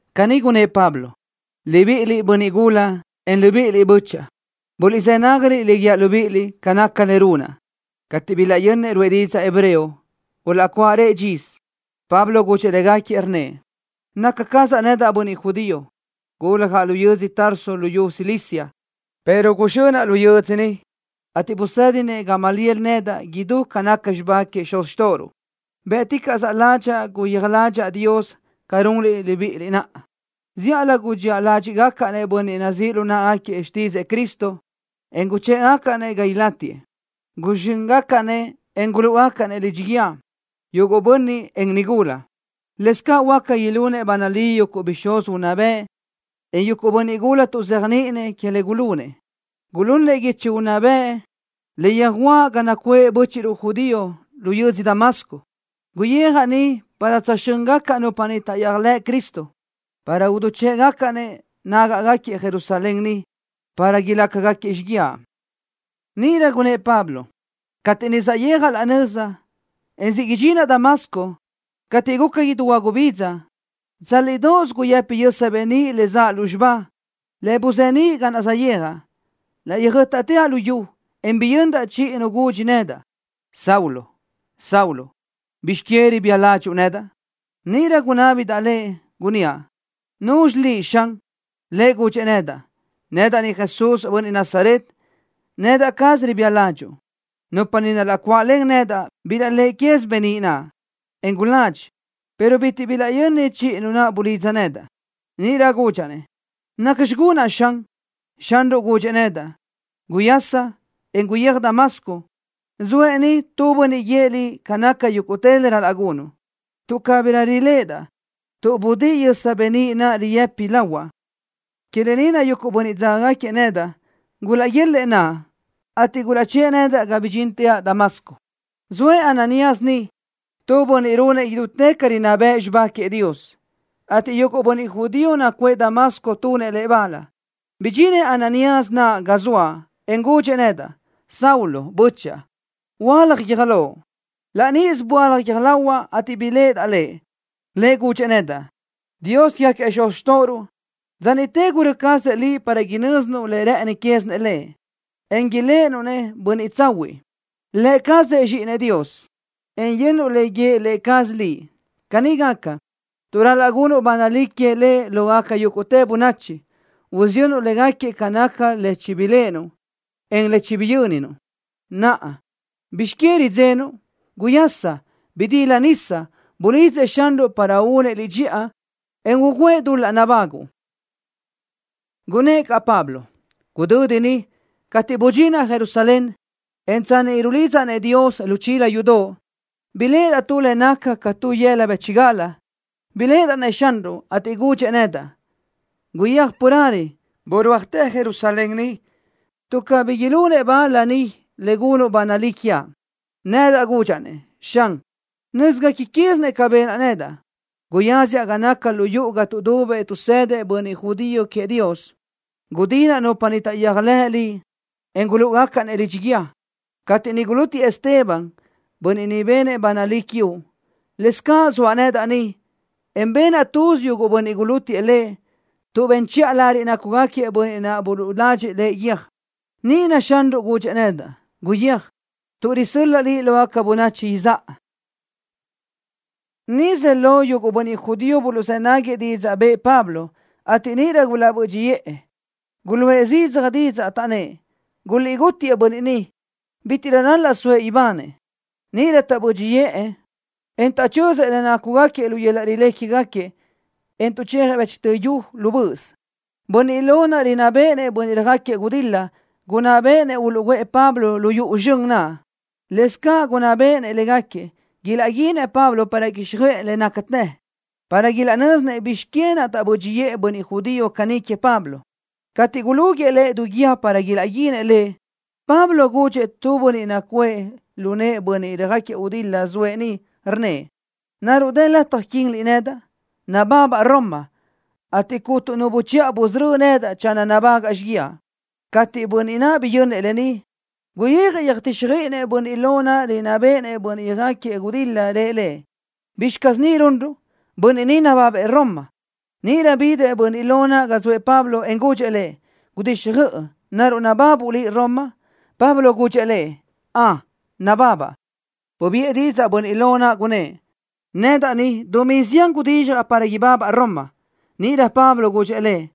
Caní gunnë́ʼ Pablo: —Libiʼiliʼ, bönniʼ gula, en libíʼiliʼ bö́chaʼa. Buliʼzë́ nágaliʼ le guíaʼ libíʼiliʼ ca naca le runaʼ. Cateʼ bilaʼyönnëʼ ruʼë didzaʼ hebreo, gulaʼcuáʼarëʼ dxisö. Pablo gudxëʼ légaquiëʼ, rnnëʼ: —Naca cazaʼ nedaʼ bönniʼ judío. Guljaʼ lu yödzö Tarso luyú Cilicia, pero guzxönaʼ lu yödzö ni, ateʼ busédinëʼ Gamaliel nedaʼ idú ca naca xibá quégaquiëʼ xuz xtóʼoruʼ. Bë́ʼticaʼsö ládxaʼa guyéaj ládxaʼa Dios ca runliʼ libíʼiliʼ naʼa. Zíʼalö gudxía ládxiʼgacaʼ-nëʼ bönniʼ nazíʼ lu náʼagaquiëʼ xtídzëʼë Cristo, en guchë́ʼgacaʼ-nëʼ ga ilátiëʼ. Guzxö́ngacaʼ-nëʼ, en gulúʼugacaʼ-nëʼ lidxi guíë, yuguʼ bönniʼ, en nigula. Lëscaʼ huáca ilunëʼ ba nalí yuguʼ bixúz unná bëʼ, en yuguʼ bönniʼ gula tuʼzéajniʼinëʼ que le gulunëʼ. Gulunëʼ guichi unná bëʼ le yöjuʼa ga nacuʼë bö́chiʼruʼ judío lu yödzö Damasco. Guyijaʼ niʼ para tsöjxö́ngacaʼ nupa niʼ taʼyéajlëʼ Cristo, para idichë́ʼgacaʼ-nëʼ nágaʼgaquiëʼ Jerusalén ni, para ilácagaquiëʼ xíguiaʼ. Níʼirö gunnë́ʼ Pablo: —Cateʼ niʼ saʼyéajaʼ laʼ nöza, en siʼ idxinaʼ Damasco, cateʼ guca idú huagubidza, tsálidoʼos guyëpi yösa beníʼ le zaʼ lúzxiba, le buzeníʼ ga naʼ saʼyéajaʼ. Laʼ yöjö́taʼteaʼ lu yu, en biyöndaʼ chiʼi Nu gudxi nedaʼ: “Saulo, Saulo, ¿bizx que ribía ládxuʼu nedaʼ?” Níʼirö gunábidaʼ lëʼ, gunníaʼ: “¿Nuzxi liʼ, Xan?” Lëʼ gudxëʼ nedaʼ: “Nedaʼ ni Jesús, bönniʼ Nazaret. Nedaʼ caz ribía ládxuʼu.” Nupa niʼ gulaʼcuáʼlen nedaʼ bilaʼléʼe caz beníʼ naʼ, en guladxi, pero bitiʼ bilaʼyöni chiʼi Nu naʼ bulidza nedaʼ. Níʼirö gudxaʼ-nëʼ: “¿Nacxi gunaʼ, Xan?” Xanruʼ gudxëʼ nedaʼ: “Guyasa, en guyéaj Damasco. Zoëʼ niʼ tu bönniʼ guíëʼ liʼ ca naca yúguʼtë le ral-laʼ gunuʼ.” Tuʼ cabirö riléʼedaʼ tuʼ budíʼi yösa beníʼ naʼ guyë́pidaʼ lahuaʼ, que lë ni naʼ yuguʼ bönniʼ dzágagaquiëʼ nedaʼ gulaʼguélëʼë naʼa, ateʼ gulaʼchë́ʼë nedaʼ ga bidxínteaʼ Damasco. ’Zoëʼ Ananías niʼ, tu bönniʼ runëʼ idútë ca rinná bëʼ xibá queëʼ Dios, ateʼ yuguʼ bönniʼ judío nacuʼë Damasco tunëʼ lëʼ bal. Bidxinëʼ Ananías naʼ ga zoaʼ, en gudxëʼ nedaʼ: “Saulo, bö́chaʼa, huöálaj guiö́j loʼ.” Laʼ níʼisö böálaj guiö́j lahuaʼ, ateʼ biléʼedaʼ lëʼ. Lëʼ gudxëʼ nedaʼ: “Dios quégaquiëʼ xuz xtóʼoruʼ, dza niʼte gurö́ cazëʼ liʼ para inö́zinuʼ le rë́ʼëni quézinëʼ Lëʼ, en iléʼenuʼ-nëʼ Bönniʼ Tsahuiʼ, Lë cazëʼ Zxíʼinëʼ, en yönnuʼ le guíëʼ Lë cazëʼ liʼ. Caní gaca, tuʼ ral-laʼ gunuʼ ba nalí queëʼ Lëʼ lógaca yúguʼtë bönachi, usiyönnuʼ légaquiëʼ ca naca le chibiléʼenuʼ, en le chibiyö́ninuʼ. Naʼa, ¿bizx que ridzenuʼ? ¡Guyasa, en bidila nisa! Bulidzëʼ Xanruʼ para únëʼ liʼ dxiʼa, en ugǘëʼ dul-laʼ nabáguʼu.” Gunnë́ʼ caʼ Pablo: —Gudö́di niʼ, cateʼ budxinaʼ Jerusalén, en tsanni niʼ rulidzaʼ-nëʼ Dios lu chila yudoʼ, biléʼedaʼ tu le naca ca tu lu yëla bë́chigal. Biléʼedaʼ-nëʼ Xanruʼ, ateʼ gudxëʼ nedaʼ: “¡Guyéaj carelö! ¡Burúajtë Jerusalén ni, tuʼ cabí ilunëʼ bal bönniʼ ni le gunuʼ ba nalí quiaʼ!” Nedaʼ gudxaʼ-nëʼ: “Xan, nö́zgaca quézinëʼ ca benaʼ nedaʼ. Guyáziaʼ gapa naca lu yuʼu ga tuʼdubëʼ tuʼsëdëʼ bönniʼ judío queëʼ Dios. Gudinaʼ nupa niʼ taʼyéajlëʼ Liʼ, en gulúʼugacaʼ-nëʼ lidxi guíë. Cateʼ niʼ gulútiëʼ Esteban, bönniʼ niʼ benëʼ ba nalí quiuʼ, lëscaʼ zoaʼ nedaʼ niʼ, en benaʼ tuz yuguʼ bönniʼ gulútiëʼ lëʼ tuʼ ben chiʼa lariʼ nácugaquiëʼ bönniʼ naʼ buluʼladxëʼ lëʼ guiö́j.” Níʼirö Xanruʼ gudxëʼ nedaʼ: “Guyéaj, tuʼ risö́l-laʼa liʼ lógaca bönachi izáʼa.” Nisö ze lo yuguʼ bönniʼ judío buluʼzë́ nágagaquiëʼ didzaʼ bëʼë Pablo, ateʼ níʼirö gulaʼbö́dxiʼë. Guluʼë zidzaj didzaʼ, taʼnnë́ʼ: —¡Guliʼgútiëʼ bönniʼ ni! ¡Bítiʼrö ral-laʼ soëʼ ibanëʼ! Níʼirö tuʼ taʼbö́dxiʼë, en taʼchözëʼ le nácugaquiëʼ lu yöl-laʼ rilé quégaquiëʼ, en tuʼchejëʼ bëchtö yu lu böʼös, bönniʼ lo naʼ rinná béʼenëʼ bönniʼ röjáquiëʼ gudil-la gunná bëʼë uluʼguʼë Pablo lu yuʼu zxön naʼ. Lëscaʼ gunná béʼenëʼ légaquiëʼ ilaʼguinëʼ Pablo para quíxjöʼë le nácatë, para ilaʼnö́zinëʼ bizx que naʼ taʼbö́dxiʼë bönniʼ judío caní queëʼ Pablo. Cateʼ gulúguiʼë lëʼ du guídi para ilaʼguinëʼ lëʼ, Pablo gudxëʼ tu bönniʼ nacuʼë lu nëʼë bönniʼ röjáquiëʼ gudil-la zoëʼ niʼ, rnnëʼ: —¿Naruʼ dë lataj quíniliʼ nedaʼ? Nababaʼ Roma, ateʼ cuntu nu buchiʼa busörö́ nedaʼ channö nabágaʼa xíguiaʼ. Cateʼ bönniʼ naʼ biyönnëʼ lë ni, guyijëʼ yöjtíxjöiʼinëʼ bönniʼ lo naʼ rinná béʼenëʼ bönniʼ röjáquiëʼ gudil-la. Rëʼ lëʼ: —¿Bizxi caz ni runruʼ? ¡Bönniʼ ni nababëʼ Roma! Níʼirö bidëʼ bönniʼ lo naʼ ga zoëʼ Pablo, en gudxëʼ lëʼ: —¡Gudixjöʼ! ¿Naruʼ nababuʼ liʼ Roma? Pablo gudxëʼ lëʼ: —Ön, nababaʼ. Bubiʼë didzaʼ bönniʼ lo naʼ, gunnë́ʼ: —Nedaʼ ni, dumí zián gudizxjaʼ para ibabaʼ Roma. Níʼirö Pablo gudxëʼ lëʼ: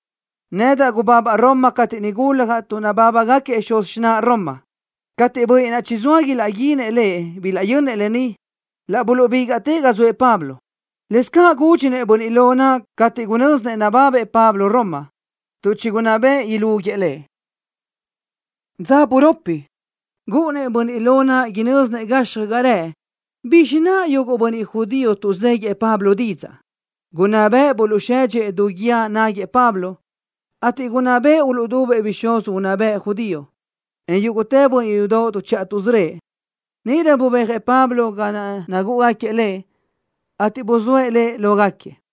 —Nedaʼ gubabaʼ Roma cateʼ niʼ guljaʼ tuʼ nabábagaquiëʼ xuz xináʼa Roma. Cateʼ bönniʼ naʼ chizóa ilaʼguinëʼ lëʼ bilaʼyönnëʼ lë ni, laʼ buluʼbígaʼtëʼ ga zoëʼ Pablo. Lëscaʼ gúdxinëʼ bönniʼ lo naʼ cateʼ gunö́zinëʼ nababëʼ Pablo Roma, tuʼ chigunná bëʼë ilúguiëʼ lëʼ. Dza buropi niʼ, gúʼunnëʼ bönniʼ lo naʼ inö́zinëʼ gazxi ga rëʼ bizxi naʼ yuguʼ bönniʼ judío tuʼzéguiëʼ Pablo didzaʼ. Gunná bëʼë buluʼsedxëʼ du guíë naʼ náguëʼë Pablo, ateʼ gunná bëʼë uluʼdubëʼ bixúz unná bëʼ judío, en yúguʼtë bönniʼ yudoʼ tuʼchiʼa tuʼsörö́ëʼ. Níʼirö bubéajëʼ Pablo ga naʼ nagúʼugaquiëʼ lëʼ, ateʼ buzóëʼ lëʼ lógaquiëʼ.